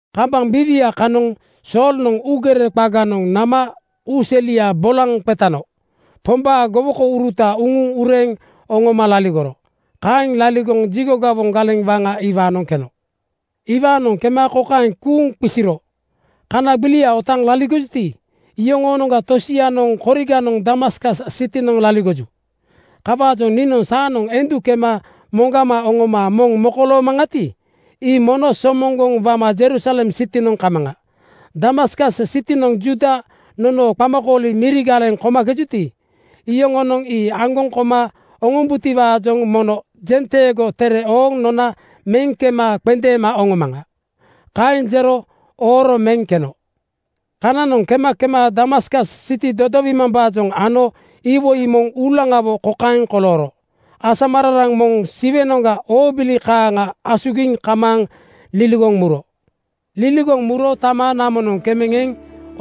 Kambaŋ biiwia kanoŋ Soolnoŋ uugere qaganoŋ nama uu selia bolaŋ qetano Pombaa gowokouruta uŋuŋ ureeŋ oŋoma laligoro. Kaeŋ laligoŋ jigo gawoŋ galeŋ waŋa iwaanoŋ keno. Iwaanoŋ kema kokaeŋ kuuŋ qisiro, “Kana gbilia otaaŋ laligojuti, iyoŋoonoŋga tosianoŋ koriganoŋ Damaskas sitinoŋ laligoju. Kawaajoŋ niinoŋ saanoŋ endu kema moŋgama oŋoma moŋ mokoloomaŋati, ii mono somoŋgoŋ wama Jerusalem sitinoŋ kamaŋa. Damaskas sitinoŋ Juuda nonoo qamakooli miri galeŋ komakejuti, iyoŋonoŋ ii aŋgoŋ koma oŋombubotiwaajoŋ mono jenteego tere ooŋ nona meŋ kema qendeema oŋomaŋa.” Kaeŋ jero ooro meŋ keno. Kananoŋ kema kema Damaskas siti dodowimambaajoŋ ano iwoi moŋ uulaŋawo kokaeŋ kolooro: Asamararaŋ moŋ Siwenoŋga oobili kaaŋa asugiŋ kamaaŋ liligoŋ muro. Liligoŋ muro tama namonoŋ kemeŋ eŋ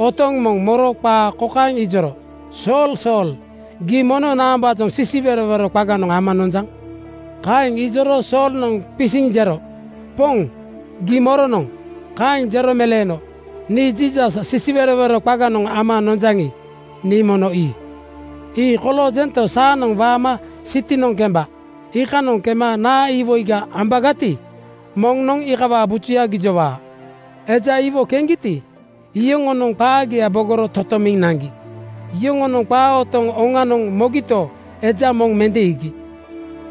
otoŋ moŋ moro qaa kokaeŋ ijoro, “Sool Sool, gii mono naambaajoŋ sisiwerowero qaganoŋ ama nonjaŋ?” Kaeŋ ijoro Soolnoŋ qisiŋ jero, “Poŋ, gii moronoŋ?” Kaeŋ jero meleeno, “Nii Jiisas sisiwerowero qaganoŋ ama nomakejaŋi, nii mono ii. Ii koloojento, saanoŋ waama sitinoŋ kemba. Iikanoŋ kema naa iwoiga ambagati, moŋnoŋ iikawaa bujuya gijowaa.” Eja iwo keŋgiti, iyoŋonoŋ qaagia bogoro totomiŋ naŋgi. Yoŋonoŋ qaa otoŋ oŋanoŋ mogito, eja moŋ mende iigi.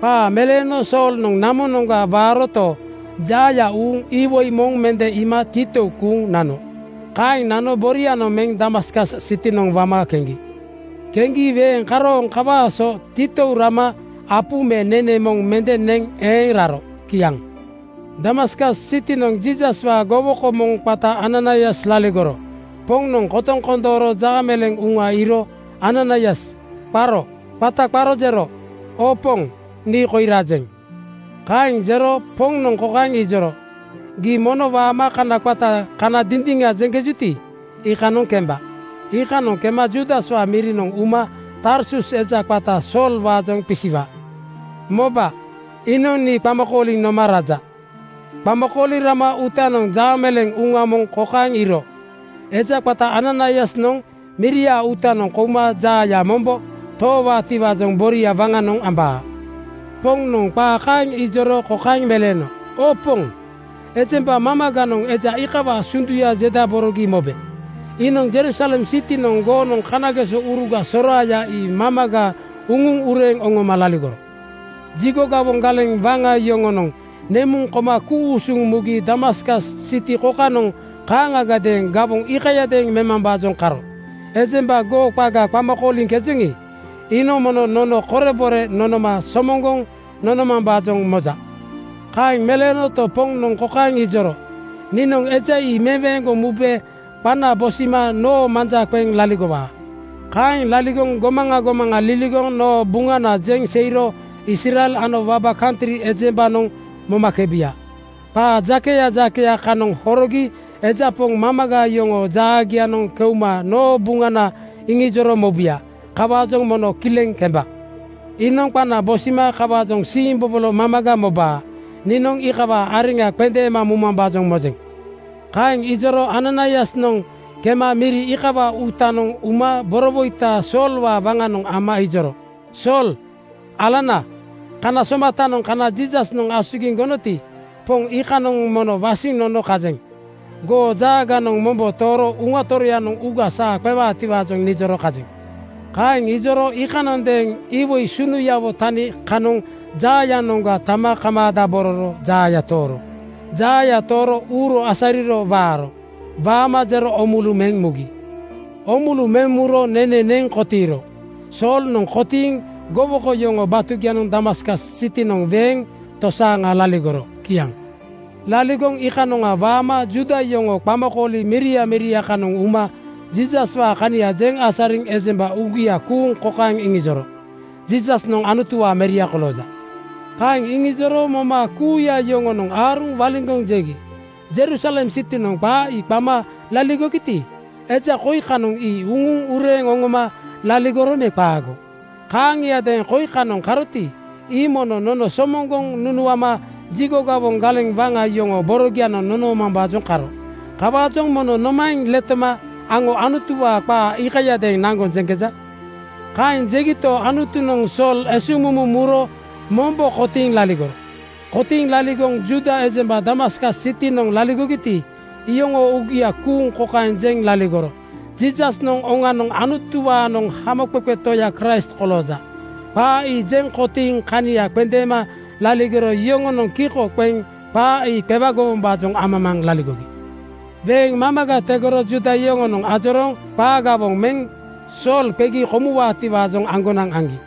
Qaa meleeno Soolnoŋ namonoŋga waaroto, jaaya uuŋ iwoi moŋ mende iima titou kuuŋ nano. Kaeŋ nano borianoŋ meŋ Damaskas sitinoŋ wama keŋgi. Keŋgi weeŋ karooŋ kawaa so titou rama apu me nene moŋ mende neŋ eeŋ raro. Kiaŋ. Damaskas sitinoŋ Jiisaswaa gowoko moŋ qata Ananaias laligoro. Poŋnoŋ kotoŋ kondooro jaameleeŋ uŋa iiro “Ananaias!” qaro. Qata qaro jero, “Oo Poŋ, nii koi rajeŋ.” Kaeŋ jero Poŋnoŋ kokaeŋ ijoro, “Gii mono waama kana qata Kana Dindiŋa jeŋkejuti, iikanoŋ kemba. Iikanoŋ kema Juudaswaa mirinoŋ uma Tarsus eja qata Soolwaajoŋ qisiwa. Moba, iinoŋ nii qama kooliŋ noma raja. Qama kooliŋ rama uutanoŋ jaameleeŋ uŋa moŋ kokaeŋ iiro: Eja qata Ananaiasnoŋ miria uutanoŋ kouma jaaya mombo toowaatiwaajoŋ boria waŋanoŋ ambaa.” Poŋnoŋ qaa kaeŋ ijoro kokaeŋ meleeno, “Oo Poŋ, ejemba mamaganoŋ eja iikawaa sunduya jedaborogi mobe. Iinoŋ Jerusalem sitinoŋ goonoŋ kanagesouruga soraaya ii mamaga uŋuŋ ureeŋ oŋoma laligoro. Jigo gawoŋ galeŋ waŋa yoŋonoŋ nemuŋ koma ku-usuŋ mugi Damaskas siti kokanoŋ kaaŋagadeeŋ gawoŋ iikayadeeŋ memambaajoŋ karo. Ejemba goo qaga qama kooliŋkejoŋi, iinoŋ mono nono korebore nonoma somoŋgoŋ nonomambaajoŋ moja.” Kaeŋ meleenoto, Poŋnoŋ kokaeŋ ijoro, “Niinoŋ eja ii meweeŋgoŋ mube qana bosima noo manja qeŋ laligowaa. Kaeŋ laligoŋ gomaŋa gomaŋa liligoŋ noo Buŋana jeŋ seiro Israel ano waba kantri ejembanoŋ momakebuya. Qaa jakeya jakeya kanoŋ horogi eja poŋ mamaga yoŋoo jaagianoŋ keuma noo Buŋana iŋijoro mobuya. Kawaajoŋ mono kileŋ kemba. Iinoŋ qana bosima kawaajoŋ siimbobolo mamaga mobaa. Niinoŋ iikawaa areŋa qendeema mumambaajoŋ mojeŋ.” Kaeŋ ijoro Ananaiasnoŋ kema miri iikawaa uutanoŋ uma borowoita Soolwaa waŋanoŋ ama ijoro, “Sool alana, kana somatanoŋ kana Jiisasnoŋ asugiŋ gonoti, Poŋ iikanoŋ mono wasiŋ nono kajeŋ. Goo jaaganoŋ mombo tooro Uŋa Toroyanoŋ uuga saa qewaatiwaajoŋ nijoro kajeŋ.” Kaeŋ ijoro iikanondeeŋ iwoi sunuyawo tani kanoŋ jaayanoŋga tama kamaadabororo jaaya tooro. Jaaya tooro uuro asariro waaro. Waama jero oomulu meŋ muro. Oomulu meŋ muro nene neŋ kotiiro. Soolnoŋ kotiiŋ gowoko yoŋoo batugianoŋ Damaskas sitinoŋ weeŋ tosaaŋa laligoro. Kiaŋ. Laligoŋ iikanoŋa waama Juuda yoŋoo qamakooli miria miria kanoŋ uma Jiisaswaa kania jeŋ asariŋ ejemba uugia kuuŋ kokaeŋ iŋijoro, “Jiisasnoŋ Anutuwaa meria kolooja.” Kaeŋ iŋijoro moma kuuya yoŋonoŋ aaruŋ waliŋgoŋ jegi, “Jerusalem sitinoŋ qa ii qama kooligiti, eja koi kanoŋ ii uŋuŋ ureeŋ oŋoma laligoro me qaago? Kaaŋiadeeŋ koi kanoŋ karoti, ii mono nono somoŋgoŋ nunuama jigo gawoŋ galeŋ waŋa yoŋoo borogianoŋ nonoomambaajoŋ karo. Kawaajoŋ mono nomaeŋ letoma aŋo Anutuwaa qaa iikayadeeŋ naŋgoŋ jeŋkeja?” Kaeŋ jegito, Anutunoŋ Sool esuŋmumu muro mombo kotiiŋ laligoro. Kotiiŋ laligoŋ Juuda ejemba Damaskas sitinoŋ laligogiti, iyoŋoo uugia kuuŋ kokaeŋ jeŋ laligoro, “Jiisasnoŋ oŋanoŋ Anutuwaanoŋ Hamoqeqe Toya Kraist kolooja.” Qaa ii jeŋ kotiiŋ kania qendeema laligoro yoŋonoŋ kiko qeŋ qaa ii qewagowombaajoŋ amamaaŋ laligogi. Weeŋ mamaga tegoro Juuda yoŋonoŋ ajorooŋ qaa gawoŋ meŋ Sool qegi komuwaatiwaajoŋ aŋgonaŋ aŋgi.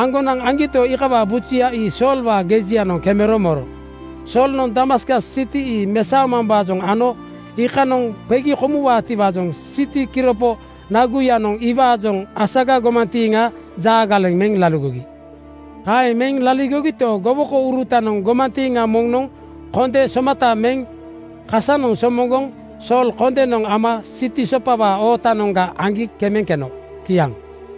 Aŋgonaŋ aŋgito, iikawaa bujuya ii Soolwaa gejianoŋ kemero moro. Soolnoŋ Damaskas siti mesaomambaajoŋ ano iikanoŋ qegi komuwaatiwaajoŋ siti kiropo naguyanoŋ iwaajoŋ asaga gomantiiŋa jaa galeŋ meŋ laligogi. Kaeŋ meŋ laligogito, gowokourutanoŋ gomantiiŋa moŋnoŋ konde (misa) somata meŋ kasanoŋ somoŋgoŋ Sool kondenoŋ ama siti sopawaa ootanoŋga aŋgi kemeŋ keno. Kiaŋ.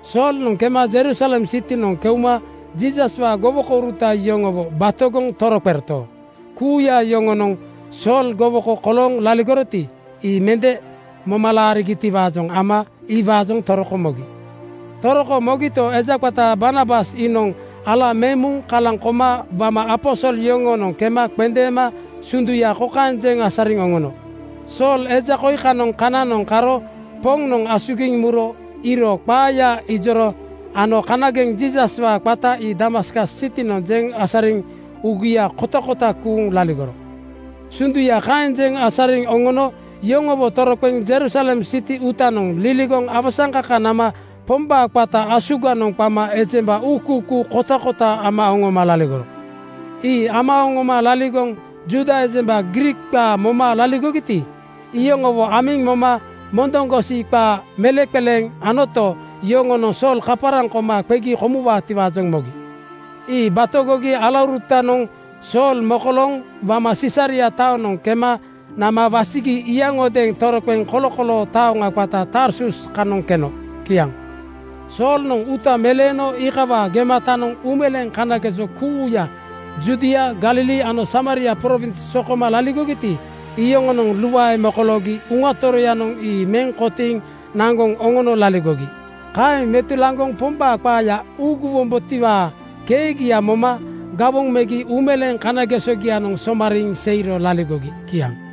Soolnoŋ kema Jerusalem sitinoŋ keuma Jiisaswaa gowokouruta yoŋowo batogoŋ toroqeroto, kuuya yoŋonoŋ Sool gowoko kolooŋ laligoroti, ii mende moma laarigitiwaajoŋ ama iwaajoŋ toroko mogi. Toroko mogito, eja qata Barnabas iinoŋ ala meŋ muŋ kalaŋ koma wama aposol yoŋoonoŋ kema qendeema sunduya kokaeŋ jeŋ asariŋ oŋono, “Sool eja koi kanoŋ kananoŋ karo Poŋnoŋ asugiŋ muro iiro qaaya ijoro ano kanageŋ Jiisaswaa qata ii Damaskas sitinoŋ jeŋ asariŋ uugia kotakota kuuŋ laligoro.” Sunduya kaeŋ jeŋ asariŋ oŋono yoŋowo toroqeŋ Jerusalem siti uutanoŋ liligoŋ awasaŋkaka nama Pombaa qata asuganoŋ qama ejemba uukuukuu kotakota ama oŋoma laligoro. Ii ama oŋoma laligoŋ Juuda ejemba Griik qaa moma laligogiti, iyoŋowo amiŋ moma mondoŋgosi qaa meleŋqeleeŋ anoto, yoŋonoŋ Sool kaparaŋ koma qegi komuwaatiwaajoŋ mogi. Ii batogi alaurutanoŋ Sool mokolooŋ wama Sisaria taonoŋ kema nama wasigi yaŋodeeŋ toroqeŋ kolokoloo taoŋa qata Tarsus kanoŋ keno. Kiaŋ. Soolnoŋ uuta meleeno iikawaa gematanoŋ uumeleeŋ kanageso kuuya Judia, Galili ano Samaria prowins sokoma laligogiti, iyoŋonoŋ luae mokoloogi Uŋa Toroyanoŋ ii meŋ kotiiŋ naŋgoŋ oŋono laligogi. Kaeŋ metulaŋgoŋ Pombaa qaaya uuguwombotiwaa keegia moma gawoŋ megi uumeleeŋ kanagesogianoŋ somariiŋ seiro laligogi. Kiaŋ.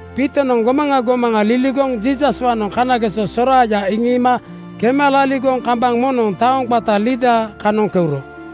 Piitonoŋ gomaŋa gomaŋa liligoŋ Jiisaswaanoŋ kanageso soraaya iŋiima kema laligoŋ kambaŋ moŋnoŋ taoŋ qata Lida kanoŋ keuro.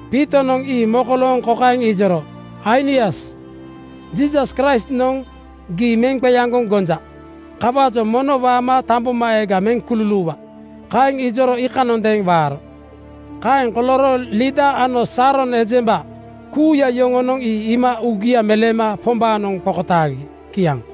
Piitonoŋ ii mokolooŋ kokaeŋ ijoro, “Ainias, Jiisas Kraistnoŋ gii meŋ qeaŋgoŋ gonja. Kawaajoŋ mono waama tambomaeega meŋ kululuuwa.” Kaeŋ ijoro iikanondeeŋ waaro. Kaeŋ kolooro Lida ano Saaron ejemba kuuya yoŋonoŋ ii iima uugia meleema Pombaanoŋ qokotaagi. Kiaŋ.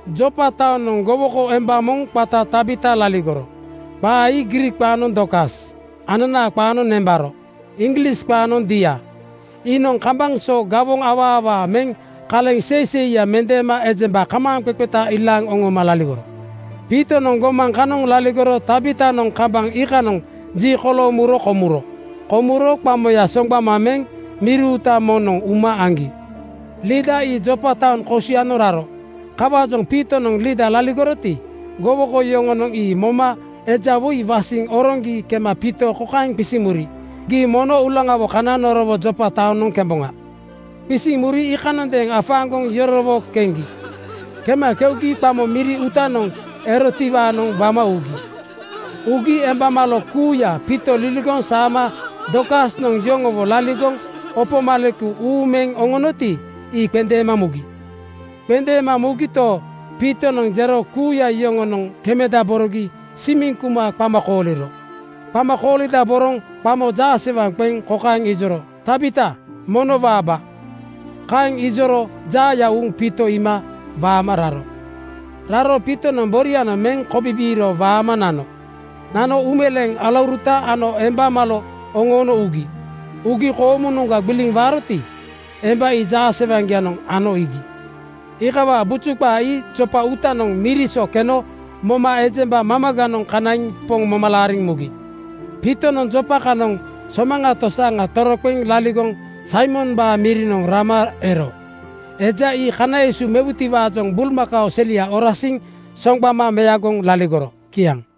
Jopa taonoŋ gowoko emba moŋ qata Tabita laligoro. (Qa ii Griik qaanoŋ Dorkas, ananaa qaanoŋ nembaro, Iŋglis qaanoŋ deer.) Iinoŋ kambaŋ so gawoŋ awaa awaa meŋ kaleŋ seiseiya mendeema ejemba kamaaŋqeqeta ilaaŋ oŋoma laligoro. Piitonoŋ gomaŋ kanoŋ laligoro Tabitanoŋ kambaŋ iikanoŋ ji kolooŋ muro komuro. Komuro qamoya soŋgbama meŋ miri uuta moŋnoŋ uma aŋgi. Lida ii Jopa taoŋ kosianoŋ raro. Kawaajoŋ Piitonoŋ Lida laligoroti, gowoko yoŋonoŋ ii moma eja woi wasiŋ oroŋgi kema Piito kokaeŋ qisiŋ muri, “Gii mono uulaŋawo kana norowo Jopa taonoŋ kemboŋa.” Qisiŋ muri iikanondeeŋ afaaŋgoŋ yorowo keŋgi. Kema keugi qamo miri uutanoŋ erotiwaanoŋ wama ugi. Ugi emba malo kuuya Piito liligoŋ saama Dorkasnoŋ yoŋowo laligoŋ opo maleku uuŋ meŋ oŋonoti, ii qendeema mugi. Qendeema mugito, Piitonoŋ jero kuuya yoŋonoŋ kemedaborogi simiŋ kuma qama kooliro. Qama koolindaboroŋ qamo jaasewaŋ qeŋ kokaeŋ ijoro, “Tabita, mono waaba.” Kaeŋ ijoro jaaya uuŋ Piito iima waama raro. Raro Piitonoŋ borianoŋ meŋ kobibiiro waama nano. Nano uumeleeŋ alauruta ano emba malo oŋoono ugi. Ugi koomunoŋga gbiliŋ waaroti, emba ii jaasewaŋgianoŋ ano iigi. Iikawaa buju qaa ii Jopa uutanoŋ miri so keno moma ejemba mamaganoŋ kanaiŋ Poŋ moma laariŋ mugi. Piitonoŋ Jopa kanoŋ somaŋa tosaaŋa toroqeŋ laligoŋ Saimombaa mirinoŋ rama ero. Eja ii kana esu mewutiwaajoŋ bulmakao selia orasiŋ soŋgbama meagoŋ laligoro. Kiaŋ.